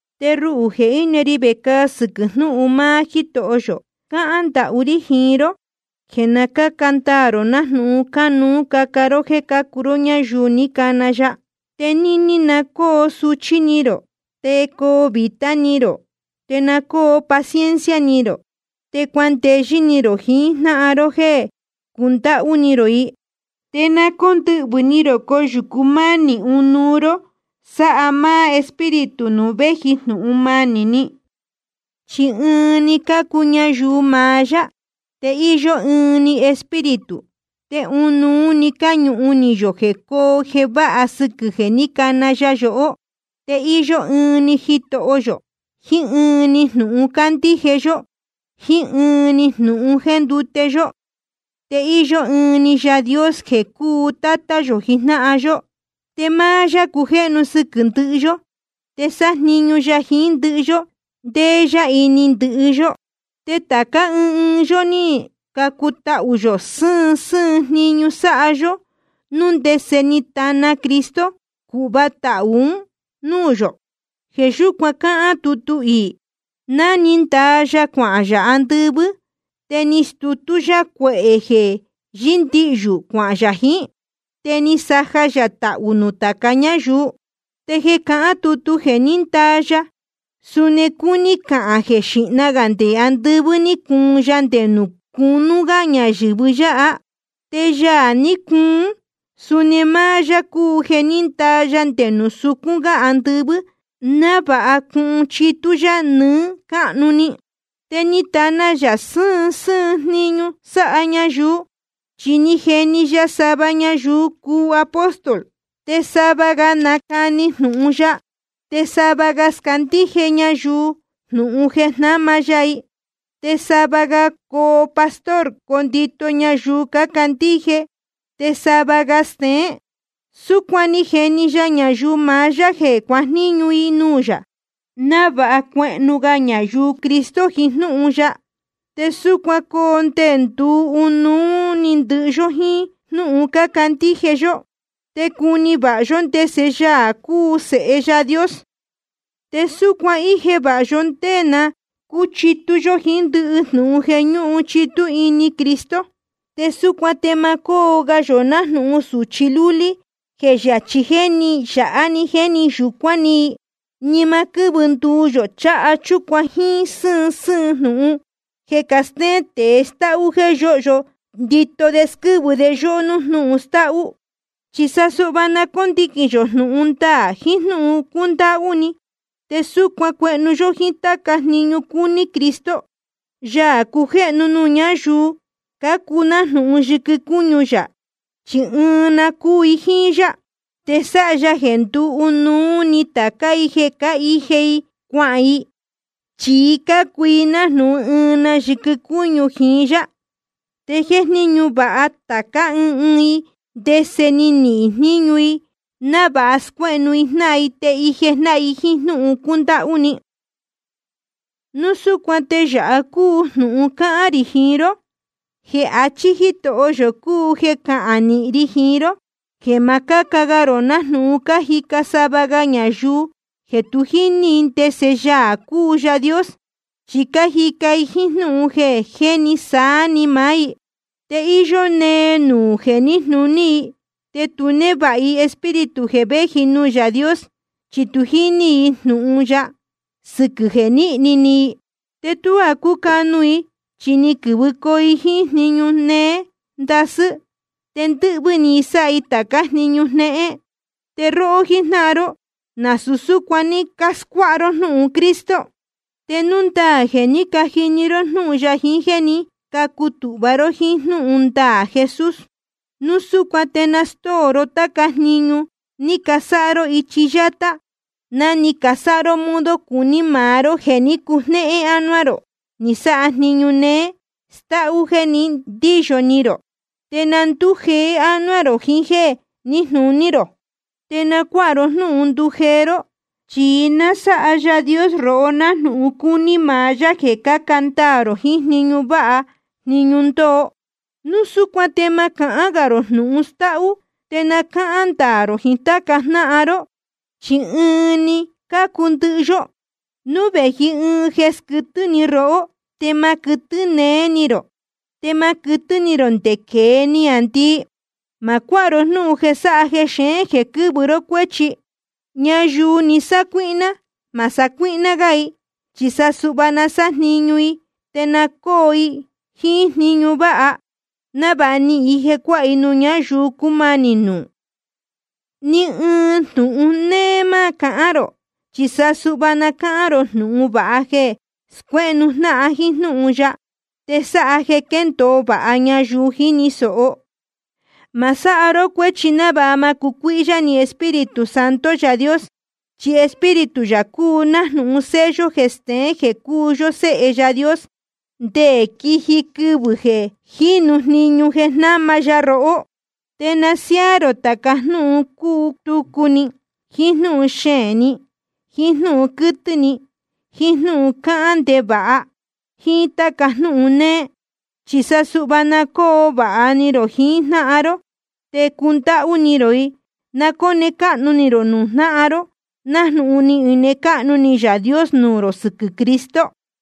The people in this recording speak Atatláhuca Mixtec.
Te ruhū jeē íne ri vecāa sɨquɨ̄ jnúhun maá Jítoho yō, cáhán ndahú rí jiín ró jeē na cáca ndaā rō nájnūhun cánuú caca ró jéē cácuu ró ñáyuu ni cana ya. Te níní na cóo suchí ni rō, te coo vītá ni rō. Te na cóo paciencia rō, te cuandeyɨ́ ni rō jiín jnáhan ró jéē cundáhú ni rō i. Te na cóndɨhvɨ̄ ni rō coyūcu mánī ɨnuú ró, sáha máá Espíritu nuū véji jnūhun manī ni. Chi ɨɨn‑ni cácuu ñayuu maá yá, te íyó ɨɨn‑ni Espíritu, te ɨnuú cáñūhun ni yō jeē cóo jeē váha sɨquɨ̄ jeē ní cana ya yohó. Te íyó ɨɨn‑ni Jitoho yō, jiín ɨɨn‑ni jnūhun cándíje yó, jíín ɨɨn‑ni jnūhun jéndute yó. Te íyó ɨɨn‑ni Yaā Dios jeē cúu Tátá yō jijnáhan yó. Te máá yá cujéhnu sɨquɨ̄ ndɨhɨ yó, te sájniñu ya jiín ndɨhɨ yó, te ndéé yá ini ndɨhɨ yó. Te tācá ɨɨn ɨɨn yó ní cacutahū yō sɨ́ɨn sɨ́ɨn jniñu sáha yó, núu ndese ni tana Cristo cūhva tahū un núū yō. Jeē yúcuan cáhán tutu iī: Ná ni ndaa ya cuanuhun yā andɨvɨ́, te ni stutú yá cuehē jeē yɨ́ndihyū, cuahān yā jiín. Te ni saja ya tahū nuū tāca ñáyuu. Te jeē cahán tutu jeē ní ndaa ya, suni cúní cahān jeē xīhna gā nde andɨvɨ́ ni cuun ya nde nuū cunú gá ñayɨ̄vɨ yáha. Te Yaā ní cuun, suni máá yá cúu jeē ní ndaa nde nuū sucún gá andɨvɨ́, návāha cuhun chitú yá nɨɨ́ cáhnu‑ni. Te ni tana ya sɨ́ɨn sɨ́ɨn jniñu sáha ñayuu. Chi ni jeni ya sava ñayuu cuu apóstol, te sava ga nacani jnūhun ya, te sava ga scándíje ñayuu jnūhun jeē jnáma ya i, te sava ga coo pastor condito ñayuu cácandíje, te sava ga steén. Súcuan ni jeni ya ñayuu maá yá jeē cuajníñu i nuū yā, návāha cuehnu ga ñayuu Cristo jiín jnúhun ya. Te súcuan coo nde nduu ɨnuú‑ni ndɨhɨ yó jíín jnúhun cándíje yó, te cuni vāha yó ndese Yaā cúu Sēhe Yaā Dios. Te súcuan ije vāha yó ndé na cúchitú yó jiín ndɨhɨ jnūhun jeē ñúhun chitú ini Cristo. Te súcuan te ma cóo ga yō nájnūhun sūchi lúlí jéē yachī jéni yāha jéni yūcuán ni i, ni ma quɨ́vɨ nduu yō cháha chúcuan jíín sɨ́ɨn sɨ́ɨn jnūhun jeé cástéén tēe stáhú jéē yóhyo ndito de squɨ́vɨ de yóhó nuū jnúhun stáhú. Chi sa suhva na cóndiquīn yō jnūhun ndaā jiín jnúhun cúndáhú ni. Te súcuan cuehnu yó jíín táca jniñu cúní Cristo, Yaā cujéhnu nuū ñáyuu cácuu nájnūhun yɨquɨ cúñu yā, chi ɨɨn na cúu i jíín yá. Te sáha ya jeē nduu ɨnuú ni tācá i jeē cáhije i cuahān i, chi cácuu i nájnūhun ɨɨn na yɨquɨ cúñu jiín yá. Te jéjníñu vāha tācá ɨɨn ɨɨn i ndese ni nihīn jníñu i, návāha scuéhnu jnáhan te ije jíjnáhan jíín jnúhun cúndáhú ni. Núu súcuan te yāha cúu jnūhun cáhán rī jiín ró, te jeē achí Jítoho yō cúu jeē cahán nīhin ri jiín ró: jeē ma cáca ga rō nájnūhun cájica sava ga ñayuu jeē tu jíní i ndese Yaā cúu Yaā Dios, chi cájica i jíín jnúhun jeē jéni sáá‑ni máá i. Te íyó nee nuū jeē níjnūní i, te tu névāha i Espíritu jeē véji nuū Yaā Dios, chi tu jíní i jnūhun ya, sɨquɨ̄ jeē níhni ni i. Te tuá cúcanu i, chi ni quɨ̄vɨcoo i jíín jniñu néé ndasɨ́, te ndɨ́hvɨ́ ni i sáha i tācá jniñu jnéhén. Te róhó jíjnáhan ró, nasūu súcuan ní cáscuáha ró jnúhun Cristo, te núu ndaā jeē ní cajini ró jnúhun ya jiín jéē ní cacutūhva ró jíín jnúhun ndaā Jesús. Núu súcuan te na stóo ró táca jniñu ní casáha ró ichi yátá, ná ni casáha ró modo cuní maá ró jeē ní cujnéhén ánuá rō ni sáha jniñu néé stáhú jéē ní ndiyo ni rō. Te na ndújeé ánuá rō jiín jéē níjnūní rō. Te na cuáha ró jnúhun ndujeé ró, chi nasáha Yaā Dios rohó nájnūhun cúní maá yá jeē cáca ndaā rō jiín jniñu váha jniñu ndoo. Núu súcuan te ma cahán gā rō jnūhun stáhú, te na cáhán ndaā rō jiín táca jnáhan ró, chi ɨɨn‑ni cácuu ndɨhɨ yó. Núu vēji ɨɨn jeē squɨtɨ́ ni rohó, te ma quɨtɨ́ neé ni rō. Te ma quɨtɨ́ ni rō nde quēe niāndii. Ma cuáha ró jnúhun jeē sáha jexeén jeē quɨ́vɨ ró cuéchi. Ñayuu ní sacuíhná, ma sacuíhná gá i, chi sa suhva na sájniñu i, te na cócuu i jíín jniñu váha, návāha nihīn i jeē cuáha i nuū ñáyuu cúmanī nuū. Ni ɨɨn jnūhun néé ma cahán rō, chi sa suhva na cáhán rō jnūhun vāha jeē scuéhnu jnáhan jíín jnúhun ya, te sáha jeē quéndōo vāha ñayuu jíni sōho. Ma sáha ró cuéchi návāha ma cucuíhyá ni Espíritu Santo Yaā Dios. Chi Espíritu yā cúu nájnūhun sello jeē steén jeē cúu yó séhe Yaā Dios, nde quiji quɨvɨ̄ jínu jniñu jeē jnáma ya rohó. Te na siáá rō tāca jnúhun cútucu ni, jiín jnúhun xeēn ni, jiín jnúhun quɨ́tɨ́ ni, jiín jnúhun cáhán ndevāha, jíín táca jnúhun néé. Chi sa suhva na cóo vāha ni rō jiín jnáhan ró, te cundáhú ni rō i. Na cóne cáhnu ni rō nuū jnáhan ró, nájnūhun ni ine cáhnu ni Yaā Dios nuū rō sɨquɨ̄ Cristo.